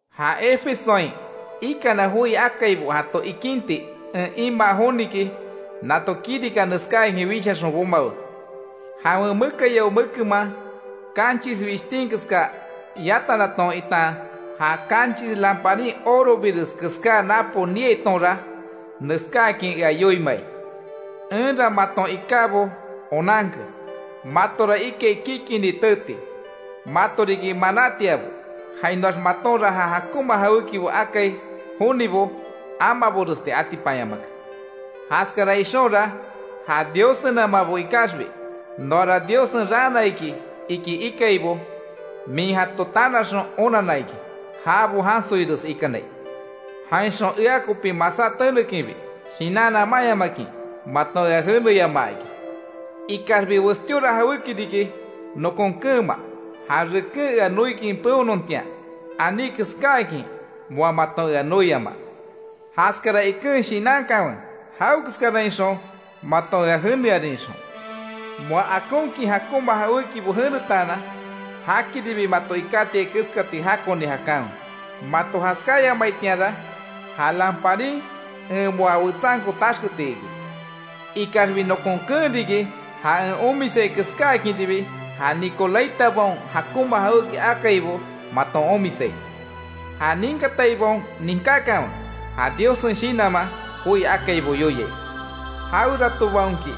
Ja Efesoain ikana joi akaibo jato ikinti en imaa joniki, nato kirika neskáakin wishaxon bomawe. Jawen mekayao mekenman kanchis wishtin keska yatannaton, itan ja kanchis lamparin orobires keská napo niaitonra, neskáakin ea yoiimai. Enra maton ikábo onanke; matora ikai kikini teeti, mato riki manatiabo; jainoax matonra ja jakonma jawékibo akai jonibo amaboresti atipanyamake. Jaskara ixonra, ja Diossenamabo ikaxbi noara Diossen raana iki ikaibo min jato tanaxon onanna iki, jabo jansoires ikanai. Jainxon ea kopi masá tenekinbi, shinan namanyamakin maton ea jeneyamaa iki. Ikaxbi westíora jawéki riki nokon keenma: Ja reken ea noikin peonontian aní keskáakin moa maton ea noiama. Jaskara iken shinankanwe, jawekeskarainxon maton ea jenearin ixon. Moa akonkin jakonma jawékibo jenetaanan, jakiribi mato ikátiai keskati jakoni jakanwe. Mato jaskayamaitianra ja lamparin en moa wetsanko taxketi iki. Ikaxbi nokon keen riki, ja en omisai keskáakinribi ja Nicolaitabaon jakonma jawéki akaibo maton omisai. ¡Ja ninkataibaon ninkákanwe, ja Diossen Shinanman joi akaibo yoiai! Jaweratobaonki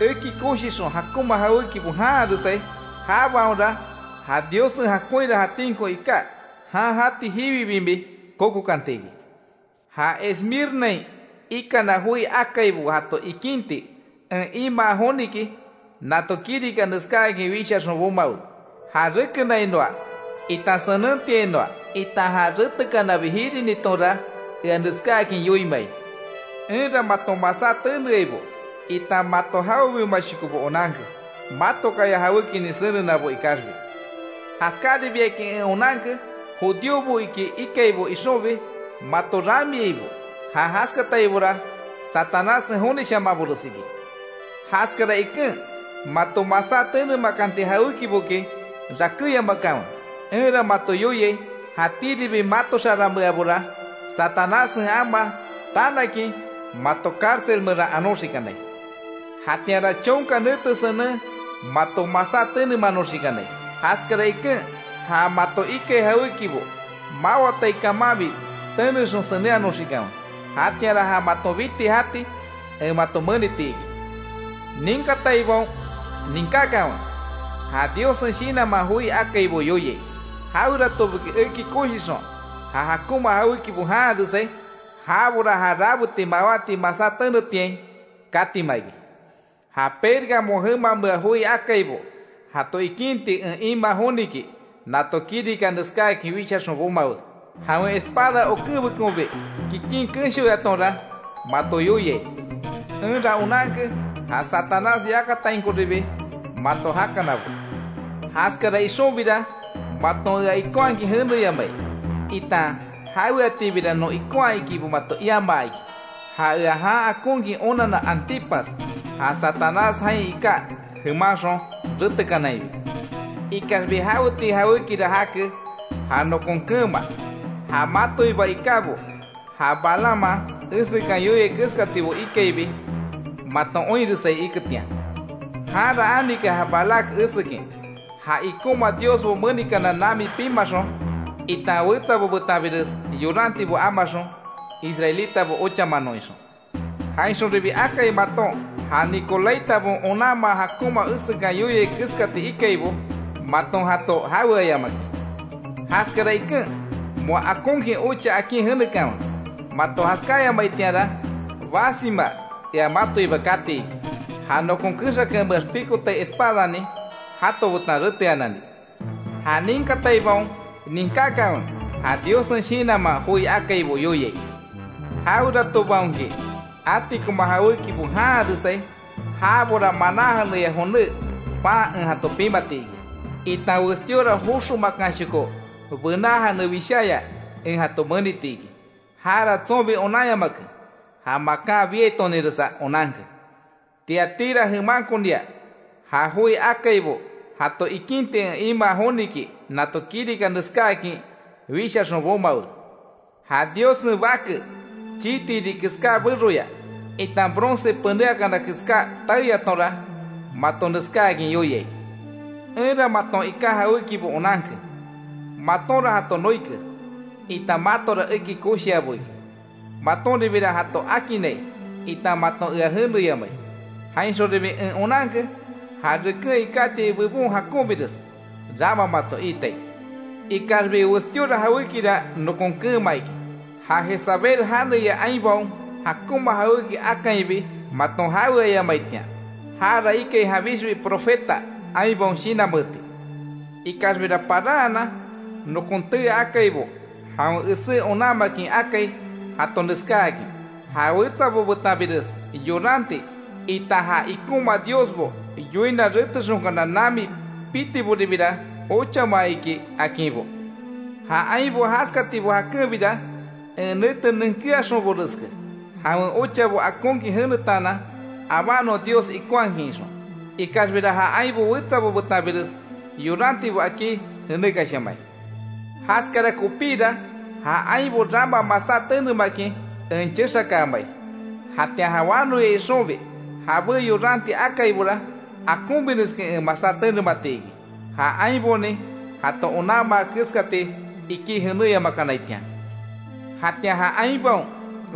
eki koshixon jakonma jawékibo janharesai, jabaonra ja Diossen jakonhira jatínko iká, jan jati jiwi bimi kokokanti iki. Ja Esmirnain ikana joi akaibo jato ikinti en imaa joniki, nato kirika neskáakin wishaxon bomawe. Ja rekenainoa, itan senentiainoa, itan ja retekanabi jirinitonra ea neskáakin yoiimai: Enra maton masá teneaibo, itan mato jawebiomashokobo onanke, matokaya jawékinin senenabo ikaxbi. Jaskaribiakin en onanke, judíobo iki ikaibo ixonbi mato ramiaibo, ja jaskataibora Satanássen jonishamanbores iki. Jaskara iken mato masá tenemakanti jawékiboki rakéyamakanwe. Enra mato yoiai; jatíribi mato xaranmeabora Satanássen amaa tanakin, mato cárcel meran anoxikanai, jatianra chonka nete senen mato masá tenemanoxikanai, jaskara iken, ja mato ikai jawékibo mawatai kamanbi tenexon senenhanoxikanwe; jatianra ja maton biti jati en mato meniti iki. ¡Ninkataibaon ninkakanwe, ja Diossen Shinanman joi akaibo yoiai! Jaweratoboki eki koshixon, ja jakonma jawékibo janharesai, jabora ja rabeti mawáti masá tenetiain katima iki. Ja Pérgamo jemamea joi akaibo jato ikinti en imaa joniki, nato kirika neskáakin wishaxon bomawe: ‘Jawen espada okenbekonbi kikin kenshoyatonra mato yoiai: Enra onanke, ja Satanás yakatainkoribi mato jakanabo. Jaskara ixonbira maton ea ikonhakin jeneyamai, itan jaweatibira non ikonhaa ikibo mato iamaa iki, ja ea jan akonkin onanna Antipas, ja Satanás jain iká jemanxon retekanainbi. Ikaxbi jaweti jawékira jake ja nokon keenma: Ja matoiba ikábo, ja Balaamman esekan yoiai keskatibo ikaibi maton oinresai iketian. Janra anike ja Balac esekin, ja ikonma diosbo menikana nami pimaxon, itan wetsabo betanbires yorantibo amaxon, israelitabo ochamanon ixon. Jainxonribi akai maton, ja Nicolaitabaon onanmaa jakonma esekan yoiai keskati ikaibo maton jato jaweayamakin. Jaskara iken, ¡Moa akonkin ocha akin jenekanwe! Mato jaskáyamaitianra basima ea matoiba kati iki; ja nokon kexakameax pikotai espadanin jato betan reteanani. ¡Ja ninkataibaon ninkakanwe, ja Diossen Shinanman joi akaibo yoiai! Jaweratobaonki atikoma jawékibo janharesai, jabora maná jeneya joné pan en jato pimati iki, itan westíora joxo makanshoko bená jane wisháya en jato meniti iki. Jara tsonbi onanyamake, ja makan biaitoninresa onanke’. Tiatira jemankonia ja joi akaibo jato ikinti en imaa joniki, nato kirika neskáakin wishaxon bomawe: ‘Ja Diossen Bake, chii tiri keská beroya, itan bronce penéakana keská taeyatonra mato neskáakin yoiai: Enra maton iká jawékibo onanke: Matonra jato noike, itan matora eki koshiabo iki, matonribira jato akinnai, itan maton ea jeneyamai. Jainxonribi en onanke, ja reken ikátiai bebon jakonbires rama mato iitai. Ikaxbi westíora jawékira nokon keenma iki: Ja Jezabel janeya ainbaon jakonma jawéki akainbi maton jaweayamaitian. Jara ikai janbixbi profeta ainbaon shinanmeeti. Ikaxbira paranhanan, nokon tee akaibo jawen esé onanmakin akai jato neskáakin, ja wetsabo betanbires yoranti, itan ja ikonma diosbo, yoina retexonkana nami pitiboribira ochama iki akinbo. Ja ainbo jaskatibo jakenbira en nete nenkeaxonboreske, jawen ochabo akonkin jenetaanan abanon Dios ikonhakin ixon. Ikaxbira ja ainbo wetsabo betanbires yorantibo akí jenekashamai. Jaskara kopíra, ja ainbo rama masá tenemakin en chexakaamai, jatian ja wanoya ixonbi jabé yoranti akaibora, akonbireskin en masá tenemati iki. Ja ainbonin jato onanmaa keskati ikí jenéyamakanaitian. Jatian ja ainbaon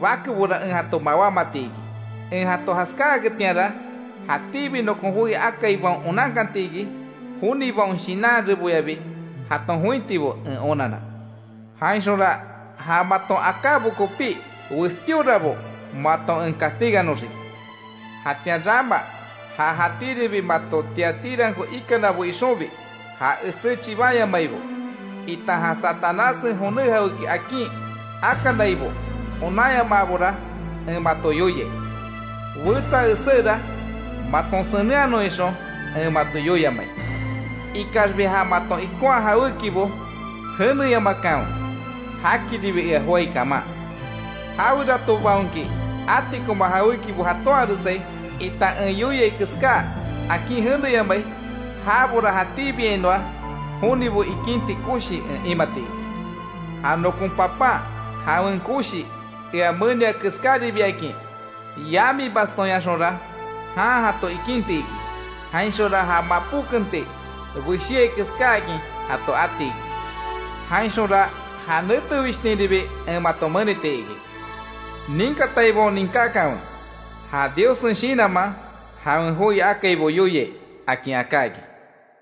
bakebora en jato mawámati iki. En jato jaskáaketianra, jatíbi nokon joi akaibaon onankanti iki, jonibaon shinan reboyabi jaton jointibo en onanna. Jainxonra ja maton akábo kopí westíorabo mato en castigannoxiki. Jatian rama ja jatíribi mato Tiatiranko ikanabo ixonbi, ja esé chibanyamaibo, itan ja Satanássen joné jawéki akin akanaibo onanyamaabora en mato yoiai; wetsa eséra, maton senenhanon ixon en mato yoiamai. Ikaxbi ja maton ikonha jawékibo jeneyamakanwe, jakiribi ea joái kaman. Jaweratobaonki atikoma jawékibo jatonharesai, itan en yoiai keská akin jeneyamai, jabora jatíbiainoa jonibo ikinti koshi en imati iki. Ja nokon Papan jawen koshi ea menia keskáribiakin. Yami bastónyaxonra jan jato ikinti iki, jainxonra ja mapó kenti beshéai keskáakin jato ati iki. Jainxonra ja nete wishtinribi en mato meniti iki. ¡Ninkataibaon ninkákanwe, ja Diossen Shinanman jawen joi akaibo yoiai!’ akin aká iki.